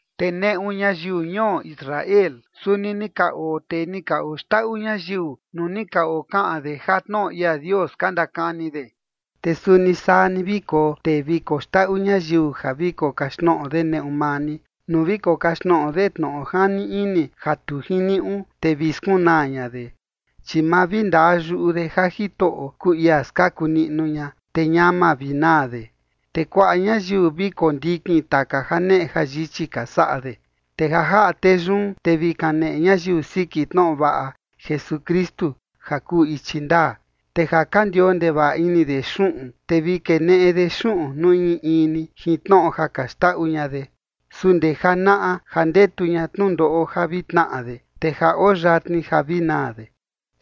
Te neꞌu ñayiu ñuo Israel suni ni ka oo tee ni ka oxndaꞌu ñayiu nuu ni ka okaꞌan de ja tnoꞌo ia Dios ka ndakani de. Te suni saa ni vi koo tee vi koxndaꞌu ñayiu ja vi kokaxtnoꞌo de neꞌu maa ni, nuu vi kokaxtnoꞌo de tnoꞌo jani ini ja tu jiniuꞌu, te vi skunaa ña de, chi ma vi ndaa yuꞌu de ja Jitoꞌo kuu ia skaku niꞌnu ña, te ñama vi naa de. Te kuaꞌa ñayiu vi kondikin taka janeꞌe jayichi ka saꞌa de. Te ja jaꞌa tee yun, te vi kaneꞌe ñayiu siki tnoꞌo vaꞌa Jesukristu ja kuu ichi ndaa. Te ja ka ndioo ndevaꞌa ini de xuꞌun, te vi keneꞌe de xuꞌun nuu in in ni jin tnoꞌo ja ka xndaꞌu ña de, su ndee janaꞌa ja ndetu ña tnundoꞌo ja vi tnaꞌa de, te ja oo yatni ja vi naa de.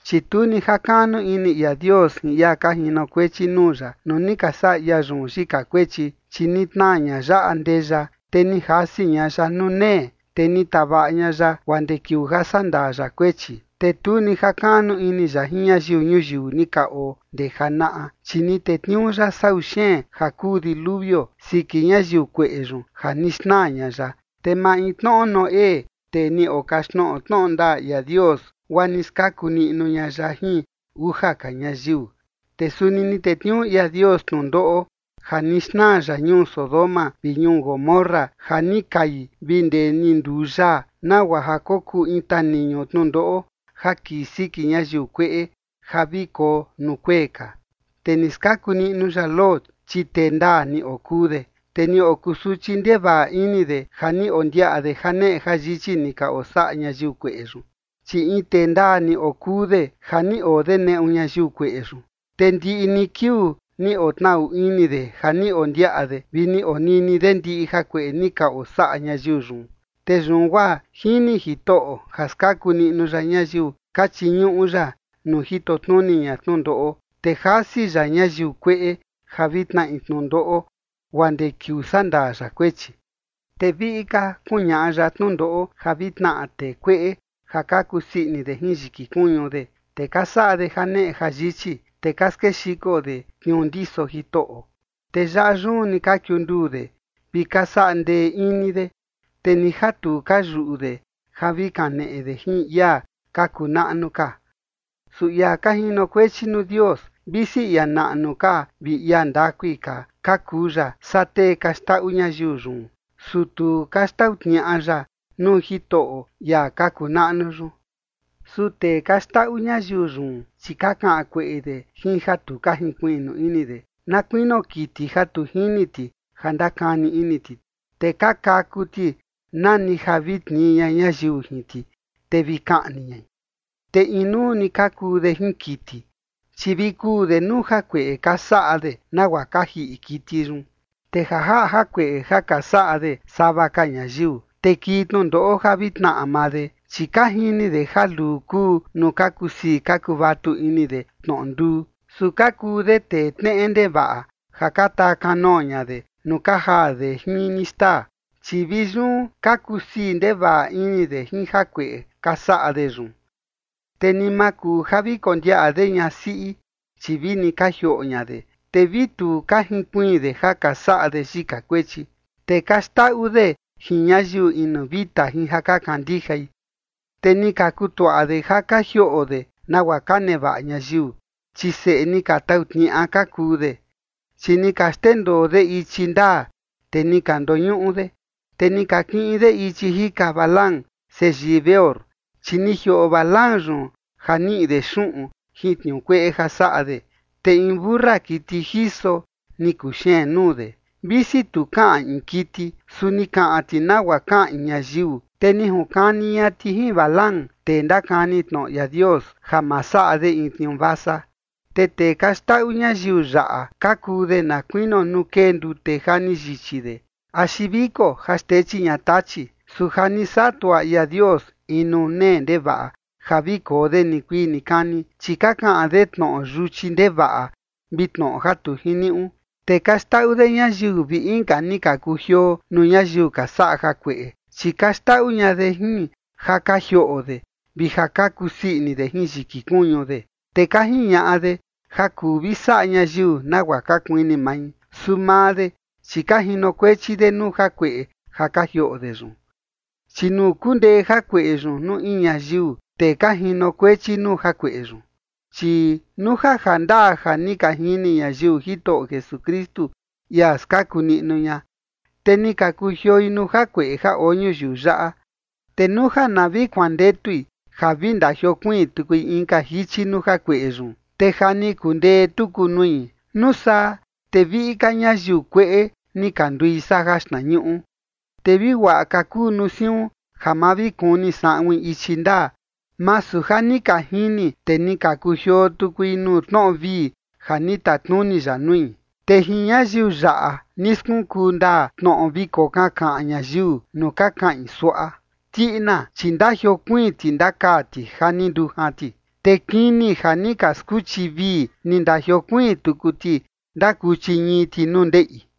Chi tu ni jakaꞌnu ini ia Dios jin ia ka jinokuechi nuu ya nuu ni ka saꞌa ia yun yika kuechi, chi ni tnaa ña ya andeya, te ni jasi ña ya nuu nee, te ni tavaꞌa ña ya guaa ndee kiuu ja sandaa ya kuechi. Te tu ni jakaꞌnu ini ya jin ñayiu ñuyiu ni ka oo ndee janaꞌa, chi ni tetniuu ya sau xeen ja kuu diluvio siki ñayiu kueꞌe yun ja ni xnaa ña ya, te maintnoꞌo Noé, tee ni okaxtnoꞌo tnoꞌo ndaa ia Dios, guaa ni skaku niꞌnu ña ya jin uja ka ñayiu. Te suni ni tetniuu ia Dios tnundoꞌo ja ni xnaa ya ñuu Sodoma vi ñuu Gomorra ja ni kai vi ndee ni nduu yaa, nagua ja kokuu in taniñu tnundoꞌo ja kii siki ñayiu kueꞌe ja vi koo nuu kuee ka. Te ni skaku niꞌnu ya Lot, chi tee ndaa ni okuu de, te ni okusuchi ndevaꞌa ini de ja ni ondiaꞌa de janeꞌe jayichi ni ka osaꞌa ñayiu kueꞌe yun. Chi in tee ndaa ni okuu de ja ni oo de neꞌu ñayiu kueꞌe yun, te ndiꞌi ni kiuu ni otnaꞌu ini de ja ni ondiaꞌa de vi ni onini de ndiꞌi jakueꞌe ni ka osaꞌa ñayiu yun. Te yun guaa jini Jitoꞌo ja skaku niꞌnu ya ñayiu ka chiñuꞌu ya nuu jito tnuni ña tnundoꞌo, te jasi ya ñayiu kueꞌe ja vi tnaꞌi tnundoꞌo guaa ndee kiuu sandaa ya kuechi. Te viꞌi ka kuñaꞌa ya tnundoꞌo ja vi tnaꞌa tee kueꞌe ja ka kusii ini de jin yiki kuñu de, te ka saꞌa de janeꞌe jayichi, te ka skexiko de tniuu ndiso Jitoꞌo. Te yaꞌa yun ni ka kiunduu de vi ka saꞌa ndee ini de, te ni ja tu ka yuꞌu de ja vi kaneꞌe de jin ia ka kuu naꞌnu ka. Su ia ka jinokuechi nuu Dios, visi ia naꞌnu ka vi ia ndakui ka ka kuu ya saa tee ka xndaꞌu ñayiu yun, su tu ka xtau tniaꞌa ya nuu Jitoꞌo ia ka kuu naꞌnu yun. Su tee ka xndaꞌu ñayiu yun, chi ka kaꞌan kueꞌe de jin ja tu ka jinkuiꞌnu ini de, na kuinio kiti ja tu jini ti ja ndakani ini ti. Te ka kaku ti nani ja vi tnii ña ñayiu jin ti, te vi kaꞌni ñai. Te inuu ni ka kuu de jin kiti, chi vi kuu de nuu jakueꞌe ka saꞌa de nagua ka jiꞌi kiti yun. Te ja jaꞌa jakueꞌe ja ka saꞌa de sava ka ñayiu, te kii tnundoꞌo ja vi tnaꞌa maa de, chi ka jini de ja luu kuu nuu ka kusii ka kuvatu ini de tnoꞌo nduu. Su ka kuu de tee tneꞌe ndevaꞌa ja ka taa kanoo ña de nuu ka jaa de jin ni xtaa, chi vi yun ka kusii ndevaꞌa ini de jin jakueꞌe ka saꞌa de yun. Te ni ma kuu ja vi kondiaꞌa de ñasiꞌi, chi vini ka jioꞌo ña de, te vi tu ka jinkuiin de ja ka saꞌa de yika kuechi. Te ka xndaꞌu de jin ñayiu inu vita jin ja ka kandijai. Te ni ka kutuaꞌa de ja ka jioꞌo de nagua ka nevaꞌa ñayiu, chi seꞌe ni ka tau tniaꞌa ka kuu de. Chi ni ka xndendoo de ichi ndaa, te ni ka ndoñuꞌu de, te ni ka kiꞌin de ichi jika Balaam, seyii Beor, chi ni jioꞌo Balaam yun ja niꞌi de xuꞌun jin tniuu kueꞌe ja saꞌa de. Te in mentu siꞌi kiti jiso ni kuxeen nuu de, visi tu kaꞌan in kiti, su ni kaꞌan ti nagua kaꞌan in ñayiu, te ni junkani ña ti jin Balaam, tee ndakani tnoꞌo ia Dios, ja ma saꞌa de in tniuu vasa. Te tee ka xndaꞌu ñayiu yaꞌa ka kuu de na kuinio nuu kee ndute ja ni yichi de axi viko ja xtechi ña tachi, su ja ni saꞌa tuaꞌa ia Dios in nuu nee ndevaꞌa ja vi koo de nikuii nikani. Chi ka kaꞌan de tnoꞌo yuchi ndevaꞌa vi tnoꞌo ja tu jiniuꞌu, te ka xndaꞌu de ñayiu vi inka ni ka kujioo nuu ñayiu ka saꞌa jakueꞌe, chi ka xndaꞌu ña de jin ja ka jioꞌo de vi ja ka kusii ini de jin yiki kuñu de. Te ka jiñaꞌa de ja kuu vi saꞌa ñayiu nagua ka kuini mai. Su maa de, chi ka jinokuechi de nuu jakueꞌe ja ka jioꞌo de yun, chi nuu kundee jakueꞌe yun nuu in ñayiu, te ka jinokuechi nuu jakueꞌe yun. Chi nuu ja jandaa ja ni ka jini ñayiu Jitoꞌo Jesukristu, ia skaku niꞌnu ña, te ni ka kujioi nuu jakueꞌe ja oo ñuyiu yaꞌa, te nuu ja na vi kuandetui ja vi ndajiokuiin tukui inka jichi nuu jakueꞌe yun, te ja ni kundee tuku nui, nuu saa te viꞌi ka ñayiu kueꞌe ni ka ndui saa jaxtnañuꞌu. Te vi guaꞌa ka kuu nuu siun ja ma vi kuni saꞌuin ichi ndaa, masu ja ni ka jini, te ni ka kujioo tukui nuu tnoꞌo vii ja ni tatnuni ya nui. Te jin ñayiu yaꞌa ni skunkuu ndaa tnoꞌo vi kokankaꞌan ñayiu nuu ka kaꞌin suaꞌa: “Tiꞌina, chi ndajiokuiin ti ndakaa ti ja ni ndujan ti”. Te “kini ja ni ka skuchi vii, ni ndajiokuiin tuku ti ndakuchi ñii ti nuu ndeꞌi”.